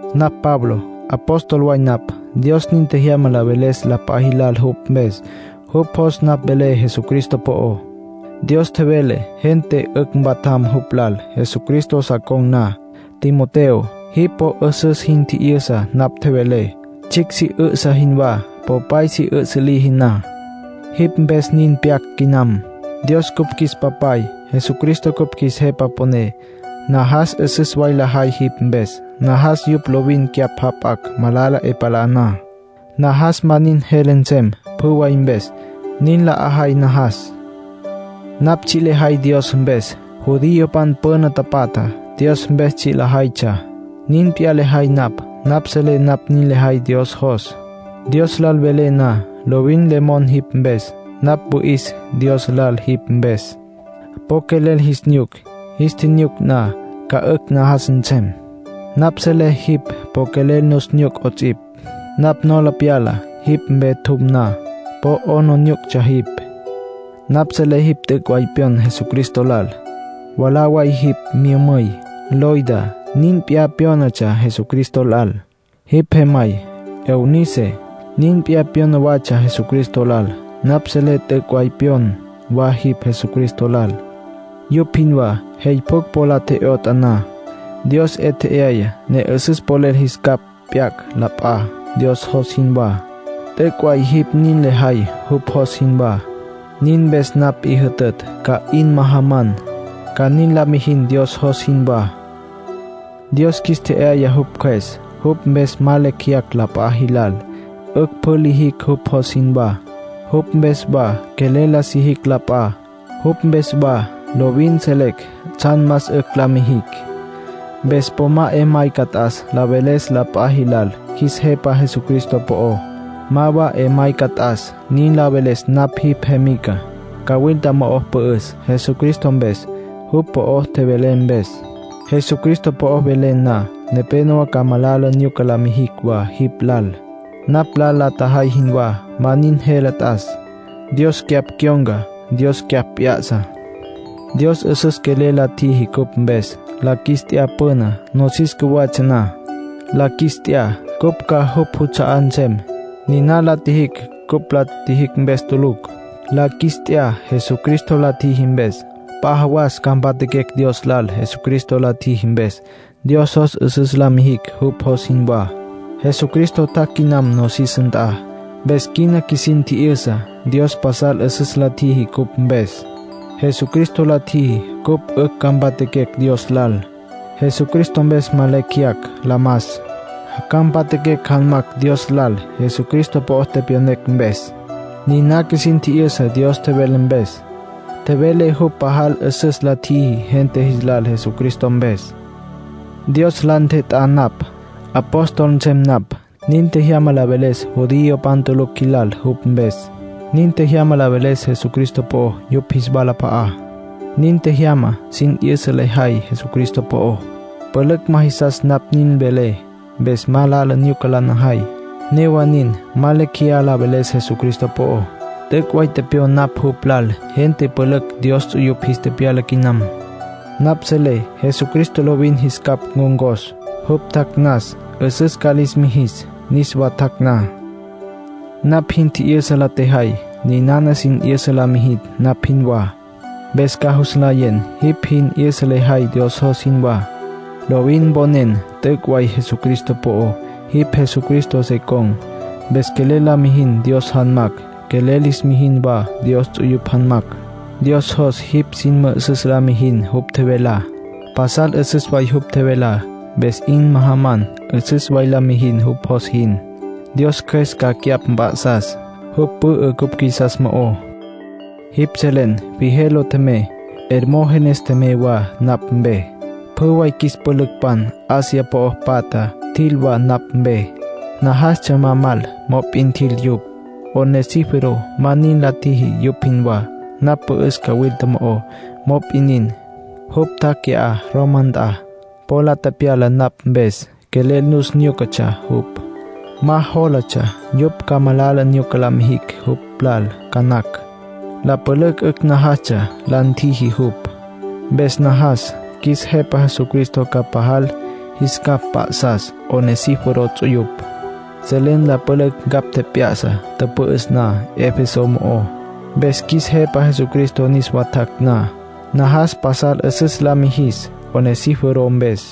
Napj Pablo. Apóstol way napj, Dios nin tjejyama la veles la p'a jilal jupj mpes. Jupj jos napj velé Jesucristo po'ó. Dios tjevele gente 'ücj mpatjam jupj lal, Jesucristo sa con̈ na. Timoteo, jipj po 'üsüs jin tji'yüsa napj tjevelé, tsjicj si 'üsǘ jinwá, popay si 'üsǘ liji na. Jipj mpes nin pyac quinam. Dios cupj qjuis Papay. Jesucristo cupj qjuis Jepa Püné. Najas 'üsüs way lajay jipj mpes. Najas yupj lovin cyapj jap'acj, malala 'e palá na. Najas ma nin jele nsem pjü way mpes; nin la 'ajay najas. Napj tsji' lejay Dios mpes. Judiopan püna tapatja Dios mpes tsji' lajaytsja; nin p'iyá lejay napj. Napj selé napj nin lejay Dios jos. Dios lal velé na, lovin le mon jipj mpes. Napj wüi'is Dios lal jipj mpes. Po quelel jis nyuc. Jis tjinyuc na, ca 'ücj najas nsem. Napj selé jipj po quelel nus nyuc 'ots'ipj. Napj nola pyala jipj mpe tjum na, po 'aplijílatsja jipj. Napj selé jipj t'üc' way pyon Jesucristo lal. Mwalá way jipj myümüy, Loida, nin p'iyá pyónatsja Jesucristo lal. Jipj jemay, Eunice, nin p'iyá pyona watsja Jesucristo lal. Napj selé t'üc' way pyon wa jipj Jesucristo lal, yupj jinwá. Jey pjucj po la tje'yotj na, Dios 'e tje'aya ne 'üsüs polel jis capj p'yacj la p'a, Dios jos jinwá. T'üc' way jipj nin lejay jupj jos jinwá. Nin mpes napj 'i jütütj ca 'in majaman, ca nin la mijin Dios jos jinwá. Dios qjuis tje'yaya jupj Cjües. Jupj mpes ma lecj jeyacj la p'a jilal. 'Ücj pjü lijicj jupj jos jinwá. Jupj mpes wa quelel la sijicj la p'a. Jupj mpes wa lovin selecj tsjan más 'ücj la mijicj. Mpes po ma 'e mayca t'as la veles la p'a jilal qjuis Jepa Jesucristo po'ó. Ma wa 'e mayca t'as nin la veles napj jipj jemica. Cawilta mo'o pü'üs Jesucristo mpes, jupj po'ó tjevelé mpes. Jesucristo po'o velen na, nepénowa ca malala nyuca la mijicj wa jipj lal, napj lal la tjajay jinwá. Ma nin jele t'as. Dios cyapj cyon̈ca. Dios cyapj p'ya'sa. Dios 'üsüs quelel la tjiji cupj mpes. La qjuis t'ya püná, nosis cjuwatsja na. La qjuis t'ya, cupj ca jupj juts'a'á nsem. Niná la tjiji cupj la tjijicj mpes tulucj. La qjuis t'ya Jesucristo la tjiji mpes. P'a jawas ca mpatjaquecj Dios lal Jesucristo la tjiji mpes. Dios jos 'üsüs la mijicj jupj jos jinwá. Jesucristo tjac' quinam nosis nt'a. Mpes quina qjuisin tji'yüsa Dios pasal 'üsüs la tjiji cupj mpes. Jesucristo la tjiji cupj 'ücj ca mpatjaquecj Dios lal. Jesucristo mpes ma lecj jeyacj la mas. Ca mpatjaquecj janmacj Dios lal Jesucristo po'o tepyonecj mpes. Niná qjuisin tji'yüsa Dios tjevele mpes. Tjevele jupj pajal 'üsüs la tjiji gente jis lal Jesucristo mpes. Dios la ntjet'á napj, apóstol nsem napj. Nin tjejyama la veles judiopan tulucj jilal jupj mpes. Nin tjejyama la veles Jesucristo po'ó yupj jis walap'a'á. Nin tjejyama sin 'yüsa lejay Jesucristo po'ó. Pülücj ma jisas napj nin velé. Mpes malala nyuca la najay. Newa nin, ma lecj jeyá la veles Jesucristo po'ó. T'üc' way tepyon napj jupj lal. Gente pülücj Dios ts'uyupj jis tepyala quinam; napj selé Jesucristo lovin jis capj ncon̈cos, jupj tjac' nas. 'Üsüs ca lis mijis, niswa tjac' na. Napj jin tji'yüsa la tjejay. Ninana sin 'yüsa lis mijin, napj jinwá. Mpes ca jus nlayen jipj sin 'yüsa lejay Dios jos jinwá. Lovin mponen t'üc' way Jesucristo po'ó. Jipj Jesucristo se con̈, mpes quelel la mijin Dios janmacj. Quelel lis mijin wa Dios ts'uyupj janmacj. Dios jos jipj sin mü'üsüs la mijin jupj tjevelá. Pasal 'üsüs way jupj tjevelá. Mpes 'in majaman 'üsüs way la mijin jupj jos jin. Dios Cjües ca cyapj mp'a'sas. Jupj pü'ü cupj qjuisas mo'ó. Jipj selen Figelo tjemey, Hermógenes tjemey wa napj mpe. Pjü way qjuis pülücpan Asia po'o patja tjil wa napj mpe. Najastsja ma mal, mop'in tjil yupj. Onesíforo ma nin la tjiji yupj jinwá. Napj pü'üs cawilta mo'ó; mop'in nin, jupj tjac' qui'á, Roma nt'a. Po la tepyala napj mpes, quelel nus nyúcatsja jupj. Ma jólatsja yupj ca malala nyuca la mijicj jupj lal ca nacj. La pülücj 'ücj najastsja la ntjiji jupj. Mpes najas qjuis Jepa Jesucristo ca pajal jis capj mp'a'sas Onesíforo ts'uyupj. Selen la pülücj ncapj tjep'ya'sa tüpü'üs na Efeso mo'ó. Mpes qjuis Jepa Jesucristo niswá tjac' na, najas pasal 'üsüs la mijis Onesíforo mpes.